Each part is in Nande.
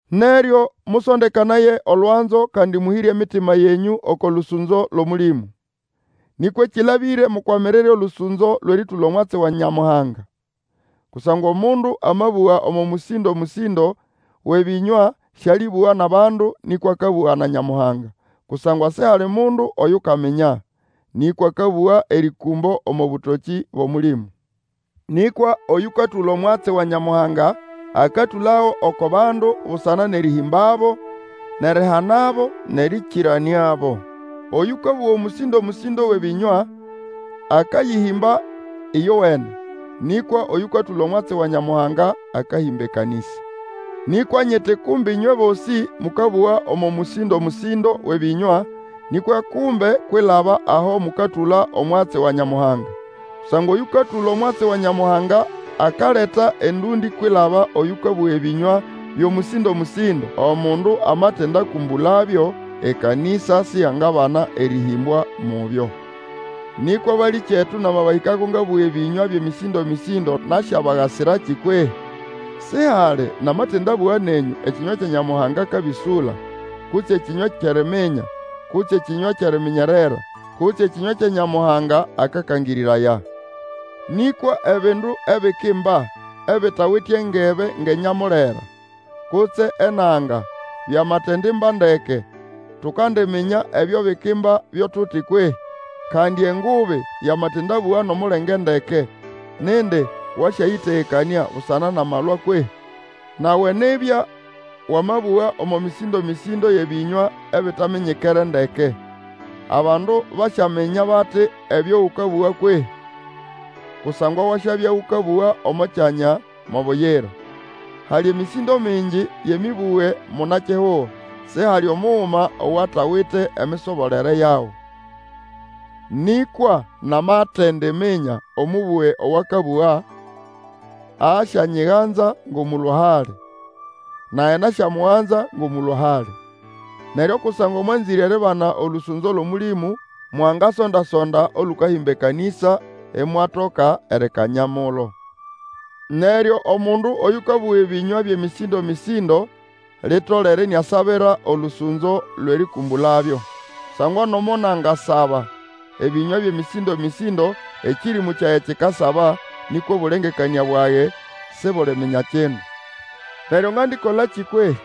Neryo mũsondekanaya olwanzo kandi mũhĩre emitima yenyũ oko lũsũnzo lwʼOmũlĩmũ. Nĩkwa ekĩlabĩre mukwamirire olũsũnzo lwʼerĩtũla omwatsi wa Nyamuhanga. Kusangwa omundu amabũga omo mũsindo-mũsĩndo wʼebĩnywa sĩalĩbũga nʼabandu, nĩkwa akabũga na Nyamuhanga, kusangwa sihali mundu oyukaminya. Nĩkwa akabũga erĩkũmbo omo bũtokĩ bwʼOmũlĩmũ. Nĩkwa oyũkatũla omwatsi wa Nyamuhanga akatũlago oko bandu busana nʼerĩhĩmbabo, nʼerihanabo, nʼerĩkĩranĩabo. Oyũkabũga omũsĩndo-mũsĩndo wʼebĩnywa akayĩhĩmba ĩyowene; nĩkwa oyũkatũla omwatsi wa Nyamuhanga akahĩmba ekanĩsa. Nĩkwa nyiti kumbe ĩnywe bosĩ mũkabũga omo mũsĩndo-mũsĩndo wʼebĩnywa, nĩkwa kumbe kwilaba aho mũkatũla omwatsi wa Nyamuhanga; kusangwa oyũkatũla omwatsi wa Nyamuhanga akaleta endũndĩ kwilaba oyũkabũga ebĩnywa byʼomũsĩndo-mũsĩndo, omundu amatindakũmbũlabyo, ekanĩsa siyangabana erĩhĩmbwa mubyo. Nĩkwa balĩkyetu, namabahĩkako ngabũga ebĩnywa byʼemĩsĩndo-mĩsĩndo nasyabagasirakĩ kwehĩ? Sihali namatindabũga nenyũ ekĩnywa Nyamuhanga akabĩsũla, kutse ekĩnywa kyʼeriminya, kutse ekĩnywa kyʼeriminyerera, kutse ekĩnywa Nyamuhanga akakangĩrĩraya. Nĩkwa ebindu ebikimba ebitawite engebe ngʼenyamulera, kutse enanga, byamatendimba ndeke, tukandiminya ebyo bikimba byo tuti kwehĩ? Kandi engubi yamatindabũga nʼomulenge ndeke, nindi wasyayĩtegekanĩa busana nʼamalwa kwehĩ? Nawe nibya wamabũga omo mĩsĩndo-mĩsĩndo yʼebĩnywa ebitaminyikere ndeke, abandu basyaminya bati ebyo ũkabũga kwehĩ? Kusangwa wasyabya ũkabũga omo kyanya mo buyira. Hali emĩsĩndo mingi yʼemĩbũge munakihugo, sihali omuguma owatawite emisobolere yago. Nĩkwa namatendiminya omũbũge owakabũga, asyanyiganza ngʼomũlũa-hali, nage nasyamugana ngʼomũlũa-hali. Neryo kusangwa mwanzĩre eribana olũsũnzo lwʼOmũlĩmũ, mwangasonda-sonda olũkahĩmba ekanĩsa, imwatoka erikanya mulo. Neryo omundu oyũkabũga ebĩnywa byʼemĩsĩndo-mĩsĩndo, litolere iniasabira olũsũnzo lwʼerĩkũmbũlabyo. Kusangwa nomo nangasaba ebĩnywa byʼemĩsĩndo-mĩsĩndo, ekĩrĩmũ kyage kikasaba, nĩkwa obũlengekanĩa bwage sibuliminya kindu. Neryo ngandikolakĩ kwehĩ?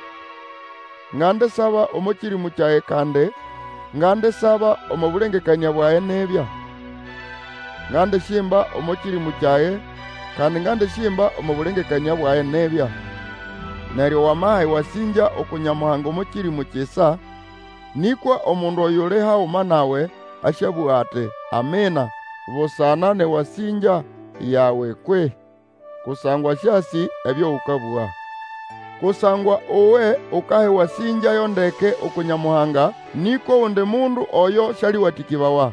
Ngandisaba omo kĩrĩmũ kyage kandi ngandisaba omo bũlengekanĩa bwage nibya. Ngandisyimba omo kĩrĩmũ kyage, kandi ngandisyimba omo bũlengekanĩa bwage nibya. Neryo wamaha ewasĩngya uku Nyamuhanga omo kĩrĩmũ kisa, nĩkwa omundu oyuli haguma nawe, asyabũga ati, Amina, busana nʼewasĩngya yawe kwehĩ? kusangwa sĩasĩ ebyo ũkabũga. Kusangwa uwe ukaha ewasĩngya yo ndeke uku Nyamuhanga, nĩkwa ogundi mundu oyo sĩalĩwatĩkĩbawa.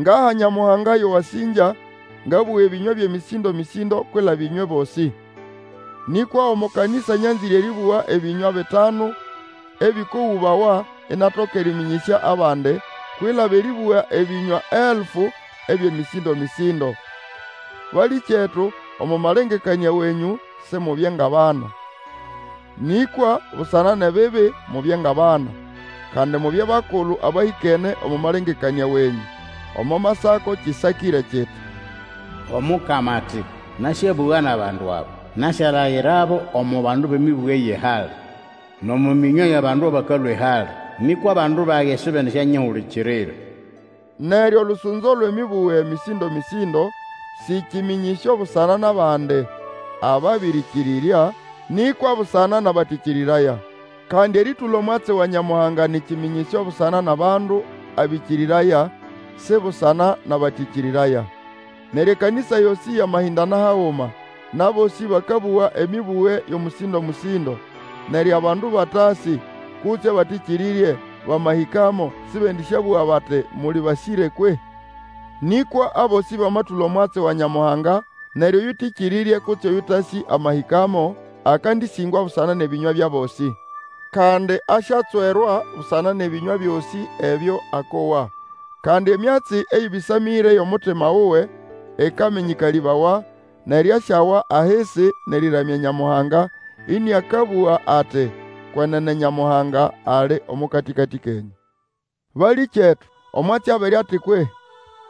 Ngaha Nyamuhanga yo wasĩngya, ngabũga ebĩnywa byʼemĩsĩndo-mĩsĩndo kwilaba ĩnywe bosĩ. Nĩkwa omo kanĩsa nyanzĩre erĩbũga ebĩnywa bitanu ebĩkogũbawa inatoka erĩmĩnyĩsya abandi, kwilaba erĩbũga ebĩnywa elfu ebyʼemĩsĩndomĩsĩndo. Balĩkyetu, omo malengekanĩa wenyũ, Simubye ngʼabana. Nĩkwa busana nʼebibi mubye ngʼabana, kandi mubye bakulu abahĩkene omo malengekanĩa wenyũ. Omo Masako kĩsakĩre kiti, Omukama ati, Nasyabũga nʼabandu aba; Nasyalayirabo omo bandu bʼemĩbũge yʼehali, Nʼomo mĩnywa yʼabandu abakalũa ehali, Nĩkwa abandu bage sibendisyanyihulikirira. Neryo olũsũnzo lwʼemĩbũge mĩsĩndomĩsĩndo sĩ kĩmĩnyĩsyo busana nʼabandi ababĩrĩkĩrĩrya, nĩkwa busana nʼabatĩkĩrĩraya. Kandi erĩtũla omwatsi wa Nyamuhanga nĩ kĩmĩnyĩsyo busana nʼabandu abĩkĩrĩraya, si busana nʼabatĩkĩrĩraya. Neryo ekanĩsa yosĩ yamahĩndana haguma, nʼabosĩ bakabũga emĩbũge yʼomũsĩndo-mũsĩndo, neryo abandu abatasĩ, kutse abatĩkĩrĩrye, bamahĩkamo sĩbendĩsyabũga bati muli basĩre kwehĩ? Nĩkwa abosĩ bamatũla omwatsi wa Nyamuhanga, neryo oyũtĩkĩrĩrye kutse oyũtasĩ amahĩkamo, akandĩsĩngwa busana nʼebĩnywa byʼabosĩ, kandi asyatswerwa busana nʼebĩnywa byosĩ ebyo akowa. Kandi emyatsi eyĩbĩsamĩre yʼomutima wuwe ĩkamĩnyĩkalĩbawa, neryo asyawa ahisi nʼerĩramya Nyamuhanga, ĩnĩakabũga ati, Kwenene Nyamuhanga ali omo katĩkatĩ kenyũ. Balĩkyetu, omwatsi abere ati kwehĩ?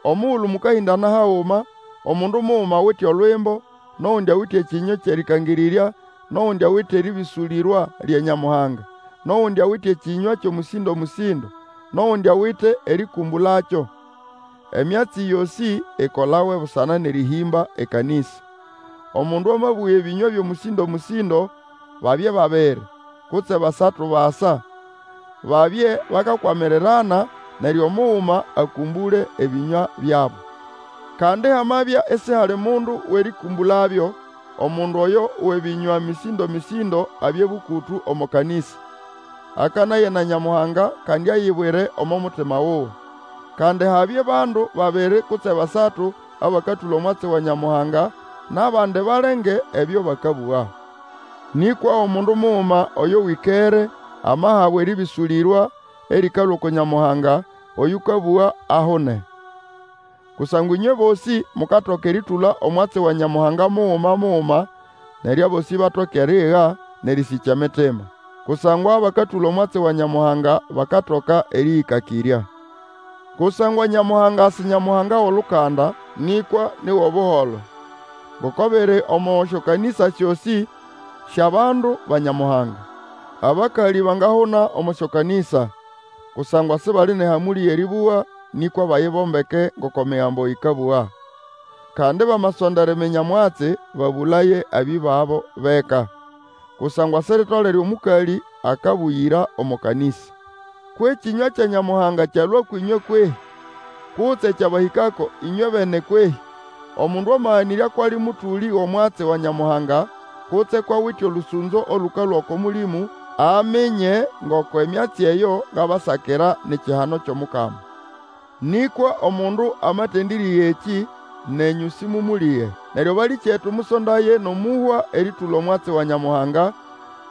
Omugulu mũkahĩndana haguma, omundu muguma awite Olwimbo, nʼogundi awite ekĩnywa kyʼerĩkangĩrĩrya, nʼogundi awite erĩbĩsũlĩrwa lya Nyamuhanga, nʼogundi awite ekĩnywa kyʼomũsĩndo-mũsĩndo, nʼogundi awite erĩkũmbũlakyo. Emyatsi yosĩ ikolawe busana nʼerĩhĩmba ekanĩsa. Omundu amabũga ebĩnywa byʼomũsĩndo-mũsĩndo, babye babiri, kutse basatu basa, babye bakakwamirirana, neryo omuguma akũmbũle ebĩnywa byabo. Kandi hamabya isihali omundu wʼerĩkũmbũlabyo, omundu oyo wʼebĩnywa mĩsĩndomĩsĩndo abye bũkũtũ omo kanĩsa; akanaye na Nyamuhanga kandi ayibwire omo mutima wuwe. Kandi habye bandu babiri kutse basatu abakatũla omwatsi wa Nyamuhanga, nʼabandi balenge ebyo bakabũga. Nĩkwa omundu muguma oyo wĩkere, amahabwa erĩbĩsũlĩrwa erĩkalũa uku Nyamuhanga, oyũkabũga ahune. Kusangwa ĩnywe bosĩ mukatoka erĩtũla omwatsi wa Nyamuhanga muguma muguma, neryo abosĩ batoke eriiga nʼerĩsĩkya emitima. Kusangwa abakatũla omwatsi wa Nyamuhanga bakatoka erĩyĩkakĩrya. Kusangwa Nyamuhanga si Nyamuhanga wʼolukanda, nĩkwa ni wʼobuholo. Ngoko biri omo syokanĩsa syosĩ syʼabandu ba Nyamuhanga, Abakalĩ bangahuna omo syokanĩsa; kusangwa sibali nʼehamũlĩ yʼerĩbũga, nĩkwa bayibombeke ngoko Emigambo ĩkabũga. Kandi bamasonda eriminya omwatsi, babũlaye abĩbabo bʼeka. Kusangwa siritolere omũkalĩ akabũgĩra omo kanĩsa. Kwʼekĩnywa kya Nyamuhanga kyalũa ũkwʼĩnywe kwehĩ? Kutse kyabahĩkako ĩnywebene kwehĩ? Omundu amaganĩrya kwʼali mũtũlĩ wʼomwatsi wa Nyamuhanga, kutse kwʼawite olũsũnzo olũkalũa oko Mũlĩmũ, aminye ngoko emyatsi eyo ngabasakira ni kihano kyʼomukama. Nĩkwa omundu amatendĩrĩga ekĩ, nenyũ sĩmũmũlĩge. Neryo balĩkyetu, mũsondaye nʼomũhwa erĩtũla omwatsi wa Nyamuhanga,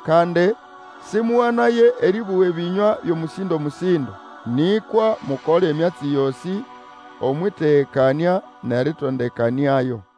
kandi sĩmũganaye erĩbũga ebĩnywa byʼomũsĩndo-mũsĩndo. Nĩkwa mukole emyatsi yosĩ Omwʼĩtegekanĩa nʼerĩtondekanĩayo.